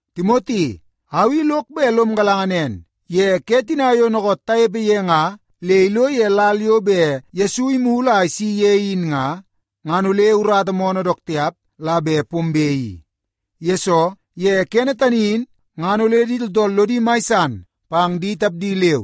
Timoti, au i lok bet lom galanga nen, ye ke tina yo dookoot tanepe ye nga le ilo ye lal yo bet Yesu imulu a isi ye in nga, ngan ole urata moonoo dook tiap la bet pombe i. Yesoo, ye kene tani in ngan ole di tooltool lodi mai san pang di tapdi leu,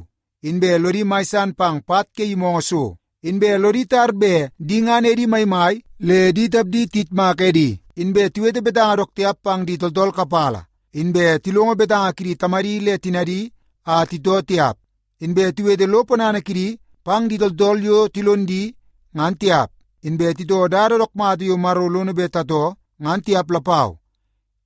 inbe lodi mai san pang pat ke yimoongoo so, inbe lodi tar bet di ngan edi maimai le di tapdi tiyitmak edi, inbe tiwete betanga dook tiap pang di tooltool kapala, inbe tilongo betanga kidi tamadi le tinadi a titoo tiap, inbe tiwete lo ponana kidi pang di tooltool yo tilon di ngan tiap, inbe titoo dada dook mata yo Maro lono bet tatoo ngan tiap lapau.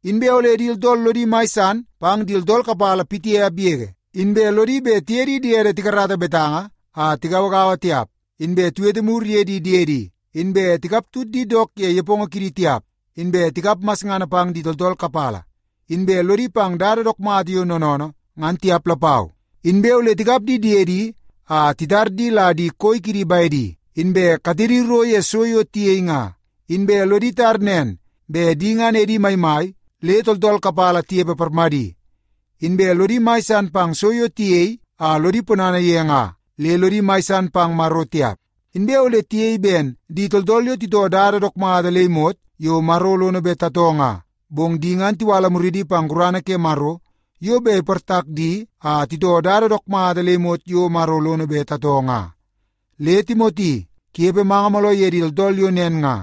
Inbe ole di tooltool lodi mai san pang di tooltool kapala pitiap yege, inbe lodi bet tiye di diedi tikarata betanga a tigauagaua tiap, inbe tiwete mur ye di diedi, inbe tikaptut di dook ye nepongo kidi tiap, inbe tikap masngana pang di tooltool kapala, inbe lodi pang dada dook mata yo noonoonoo ngan tiap lapau. Inbe ole tikap di diedi a titar di la di koi kidi bedi, inbe katedi ro ye so yo tiyei nga, inbe lodi tar nen bet di ngan edi maimai le tooltool kapala tinepe parmadi, inbe lodi mai san pang so yo tiyei a lodi ponana ye nga le lodi mai san pang Maro tiap. Inbe ole tiyei ben di tooltool yo titoo dada dook mata le imot yo Maro lono bet tatoo nga, bong di ngan tiwala muridi pang gurana ke Maro yo bet iportak di a titoo dada dook mata le imot yo Maro lono bet tatoo nga. Le Timoti, kunepe manga mooloo ye di tooltool yo nen nga.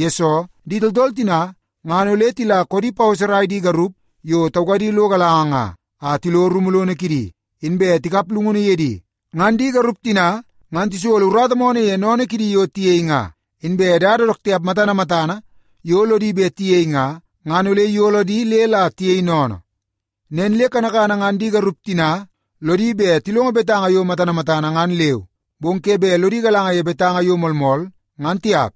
Yesoo, di tooltool tina ngan ole tila koodi paweserai di garup yo taukadi lo galanga nga, a tilo rumu lono kidi, inbe tikap llungunu ye di. Ngan di garup tina ngan tisolo urata moonoo ye sennene kidi yo tiyei nga. Inbe dada dook tiap matana matana yo lodi bet tiyei nga, ngan ole iyolo di le la tiyei sennene. Nen le kanakana ngan di garup tina lodi bet tilongo betanga yo matana matana ngan leu, bong ke bet lodi galanga ye betanga yo moolmool ngan tiap.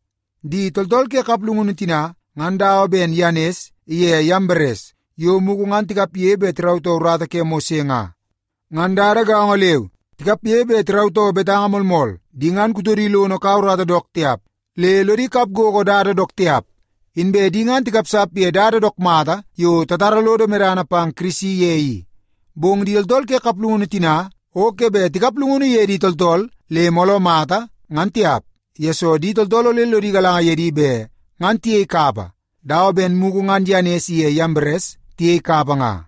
Di tooltool ke kaplungunu tina ngan dawa ben Yanes iye Yambares yo mugu ngan tikapge bet tirautoo urata ke Mose nga. Ngan dada gaongo leu, tikapge bet tirautoo betanga moolmool. Di ngan kutodi lono ikau urata dook tiap le lodi kap gogo dada dook tiap. Inbe di ngan tikapsap ye dada dook mata yo tatara lodo medana pang Kirisi ye i. Bong di tooltool ke kaplungunu tina o ke bet tikap llungunu ye di tooltool le mooloo mata ngan tiap, yesoo di tooltool ole lodi galanga ye di bet ngan tiyei kapa dawa ben mugu ngan Yanes iye Yambares tiyei kapa nga.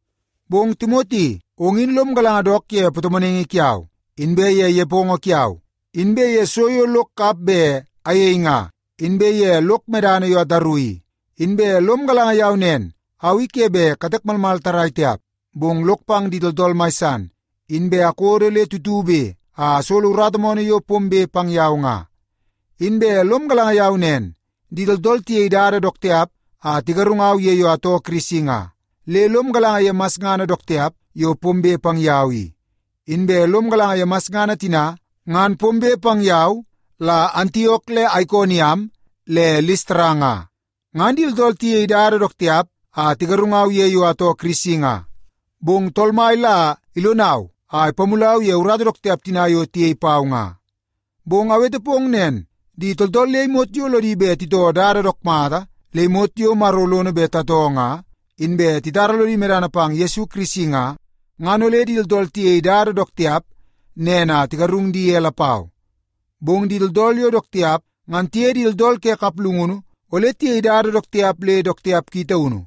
Bong Timoti, ong in lom galanga dook ye patomonaingi kiau, inbe ye nepongo kiau, inbe ye so yo lok kap bet ayei nga, inbe ye lok medana yo ataru i. Inbe lom galanga yau nen au i ke bet katek malmal tarrai tiap, bong lok pang di tooltool mai san, inbe akodo le tutube a asolo urata moonoo yo pombe pang yau nga. Inbe lom galanga yau nen, di tooltool tiyei dada dook tiap a tigarungau ye yo atoo Kirisi nga, le lom galanga ye masngana dook tiap yo pombe pang yau i. Inbe lom galanga ye masngana tina ngan pombe pang yau la Antiok le Aikoniam le Listara nga. Ngan di tooltool tiyei dada dook tiap a tigarungau ye yo atoo Kirisi nga, bong Tool Mai la ilonau a ipamulau ye urata dook tiap tina yo tiyei pau nga. Bong awete pong nen, di tooltool le imot yo lodi bet titoo dada dook mata le imot yo Maro lono bet tatoo nga, inbe titara lodi medana pang Yesu Kirisi nga, ngan ole di tooltool tiyei dada dook tiap nen a tigarung di ye lapau. Bong di tooltool yo dook tiap ngan tiye di tooltool ke kaplungunu ole tiyei dada dook tiap le dook tiap ki taunu.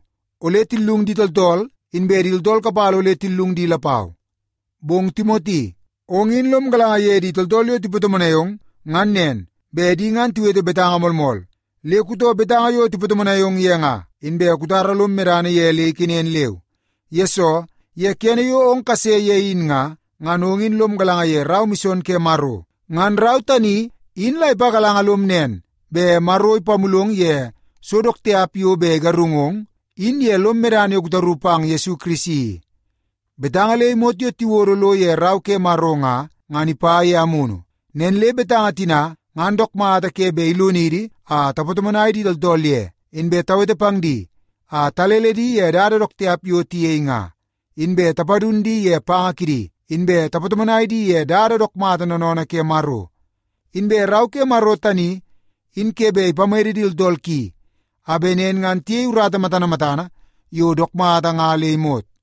Ole tillung di tooltool, inbe di tooltool kapala ole tillung di lapau. Bong Timoti, ong in lom galanga ye di tooltool yo tipatomonai ong ngan nen, bet di ngan tiwete betanga moolmool. Le kutoo betanga yo tipatomonai ong ye nga, inbe kutara lom medana ye le ikenen leu. Yesoo, ye kene yo ong kase ye in nga, ngan ong in lom galanga ye rau mison ke Maro. Ngan rau tani in la ipagalanga lom nen bet Maro ipamulong ye so dook tiap yo bet igarungong in ye lom medana yo kutaru pang Yesu Kirisi i. Betanga le imot yo tiwodo lo ye Rau ke Maro nga, ngan ipa ye Amunu. Nen le betanga tina ngan dook mata ke bet ilonidi a tapatomonai di tooltool ye, inbe tawete pang di a talele di ye dada dook tiap yo tiyei nga, inbe tapadun di ye panga kidi, inbe tapatomonai di ye dada dook mata noonoonoo ke Maro. Inbe Rau ke Maro tani in ke bet ipamede di tooltool ki a bet nen ngan tiyei urata matana matana yo dook mata nga le imot.